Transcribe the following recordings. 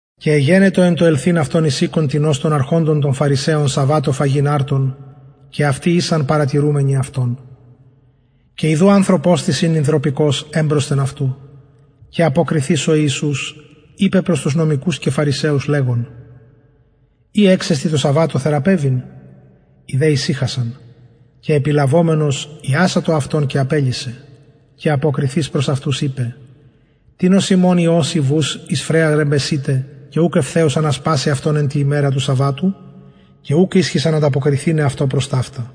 και εγενετο εν τω ελθειν αυτον εις οικον τινος των αρχοντων των φαρισαιων σαββατω φαγειν αρτον και αυτοι ησαν παρατηρουμενοι αυτον και ιδου ανθρωπος τις ην υδρωπικος εμπροσθεν αυτου και αποκριθεις ο ιησους ειπεν προς τους νομικους και φαρισαιους λεγων ει εξεστιν τω σαββατω θεραπευειν οι δε ησυχασαν και επιλαβομενος ιασατο αυτον και απελυσεν και αποκριθεις προς αυτους ειπεν τινος υμων υιος η βους εις φρεαρ εμπεσειται και ουκ ευθεως ανασπασει αυτον εν τη ημερα του σαββατου και ουκ ισχυσαν ανταποκριθηναι αυτω προς ταυτα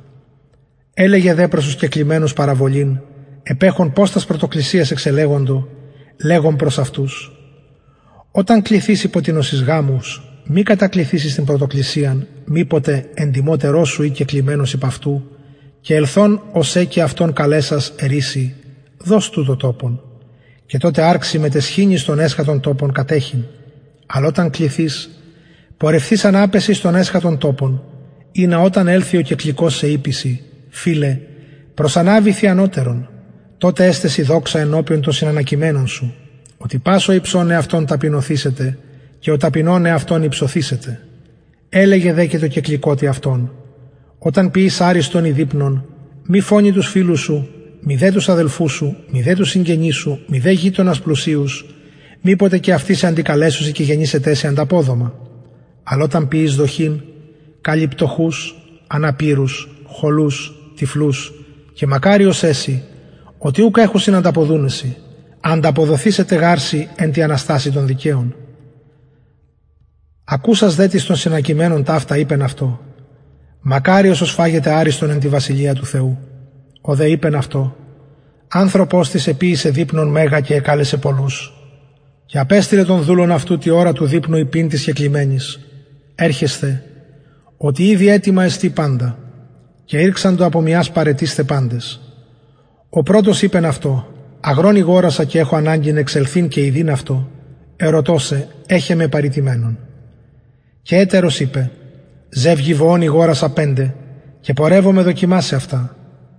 ελεγεν δε προς τους κεκλημενους παραβολην επεχων πως τας πρωτοκλισιας εξελεγοντο λεγων προς αυτους οταν κληθης υπο τινος εις γαμους μη κατακλιθης εις την πρωτοκλισιαν μηποτε εντιμοτερος σου η κεκλημενος υπ αυτου και ελθων ο σε και αυτον καλεσας ερει σοι δος τουτω τοπον και τοτε αρξη μετ αισχυνης τον εσχατον τοπον κατεχειν αλλ οταν κληθης πορευθεις αναπεσε εις τον εσχατον τοπον ινα οταν ελθη ο κεκληκως σε ειπη σοι φιλε προσαναβηθι ανωτερον τοτε εσται σοι δοξα ενωπιον των συνανακειμενων σοι οτι πας ο υψων εαυτον ταπεινωθησεται και ο ταπεινων εαυτον υψωθησεται ελεγεν δε και τω κεκληκοτι αυτον οταν ποιης αριστον η δειπνον μη φωνει τους φιλους σου μηδε τους αδελφους σου μηδε τους συγγενεις σου μηδε γειτονας πλουσιους μηποτε και αυτοι σε αντικαλεσωσιν και γενηται σοι ανταποδομα αλλ οταν ποιης δοχην καλει πτωχους αναπηρους χωλους τυφλους και μακαριος εση οτι ουκ εχουσιν ανταποδουναι σοι ανταποδοθησεται γαρ σοι εν τη αναστασει των δικαιων ακουσας δε τις των συνανακειμενων ταυτα ειπεν αυτω μακαριος ος φαγεται αριστον εν τη βασιλεια του θεου ο δε ειπεν αυτω ανθρωπος τις εποιησεν δειπνον μεγα και εκαλεσεν πολλους και απεστειλεν τον δουλον αυτου τη ωρα του δειπνου ειπειν τοις κεκλημενοις ερχεσθε οτι ηδη ετοιμα εστιν παντα και ηρξαντο απο μιας παραιτεισθαι παντες ο πρωτος ειπεν αυτω αγρον ηγορασα και εχω αναγκην εξελθειν και ιδειν αυτον ερωτω σε εχε με παρητημενον και ετερος ειπεν ζευγη βοων ηγορασα πεντε και πορευομαι δοκιμασαι αυτα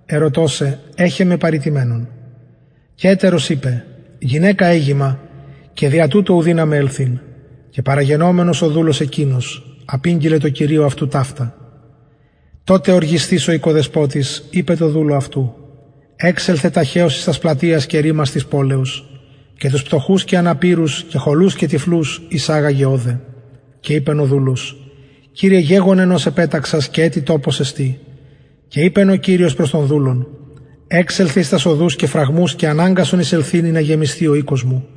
ερωτω σε εχε με παρητημενον και ετερος ειπεν γυναικα εγημα και δια τουτο ου δυναμαι ελθειν και παραγενομενος ο δουλος εκεινος απηγγειλεν τω κυριω αυτου ταυτα τοτε οργισθεις ο οικοδεσποτης ειπεν τω δουλω αυτου εξελθε ταχεως εις τας πλατειας και ρυμας της πολεως και τους πτωχους και αναπηρους και χωλους και τυφλους εισαγαγε ωδε και ειπεν ο δουλος κυριε γεγονεν ως επεταξας και ετι τοπος εστιν και ειπεν ο κυριος προς τον δουλον εξελθε εις τας οδους και φραγμους και αναγκασον εισελθειν ινα γεμισθη ο οικος μου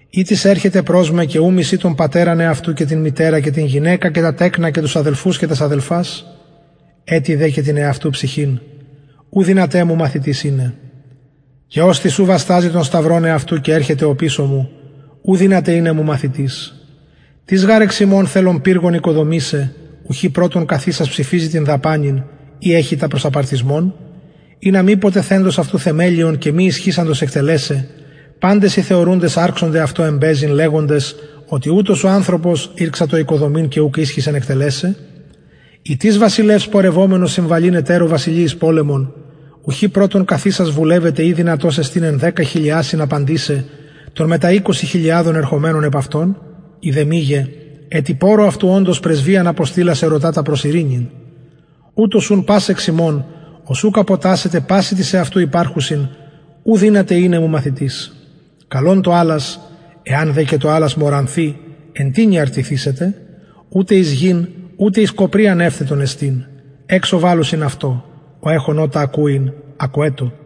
ει τις ερχεται προς με και ου μισει τον πατερα αυτου και την μητερα και την γυναικα και τα τεκνα και τους αδελφους και τας αδελφας ετι δε και την εαυτου ψυχην ου δυναται μου μαθητης ειναι και οστις ου βασταζει τον σταυρον αυτου και ερχεται οπισω μου ου δυναται ειναι μου μαθητης τις γαρ εξ υμων ο θελων πυργον οικοδομησαι ουχι πρωτον καθισας ψηφιζει την δαπανην ει εχει τα εις απαρτισμον ινα μηποτε θεντος αυτου θεμελιον και μη ισχυοντος εκτελεσαι παντες οι θεωρουντες αρξωνται εμπαιζειν αυτω λεγοντες οτι ουτος ο ανθρωπος ηρξατο οικοδομειν και ουκ ισχυσεν εκτελεσαι η τις βασιλευς πορευομενος συμβαλειν ετερω βασιλει εις πολεμον ουχι καθισας πρωτον βουλευεται ει δυνατος εστιν εν δεκα χιλιασιν απαντησαι τω μετα εικοσι χιλιαδων ερχομενω επ αυτον ει δε μηγε ετι πορρω αυτου οντος πρεσβειαν αποστειλας ερωτα τα προς ειρηνην ουτως ουν πας εξ υμων ος ουκ αποτασσεται πασιν τοις εαυτου υπαρχουσιν ου δυναται μου ειναι μαθητης καλον το αλας εαν δε το αλας μωρανθη εν τινι αρτυθησεται ουτε εις γην ουτε εις κοπριαν ευθετον εστιν εξω βαλλουσιν αυτο ο εχων ωτα ακουειν ακουετω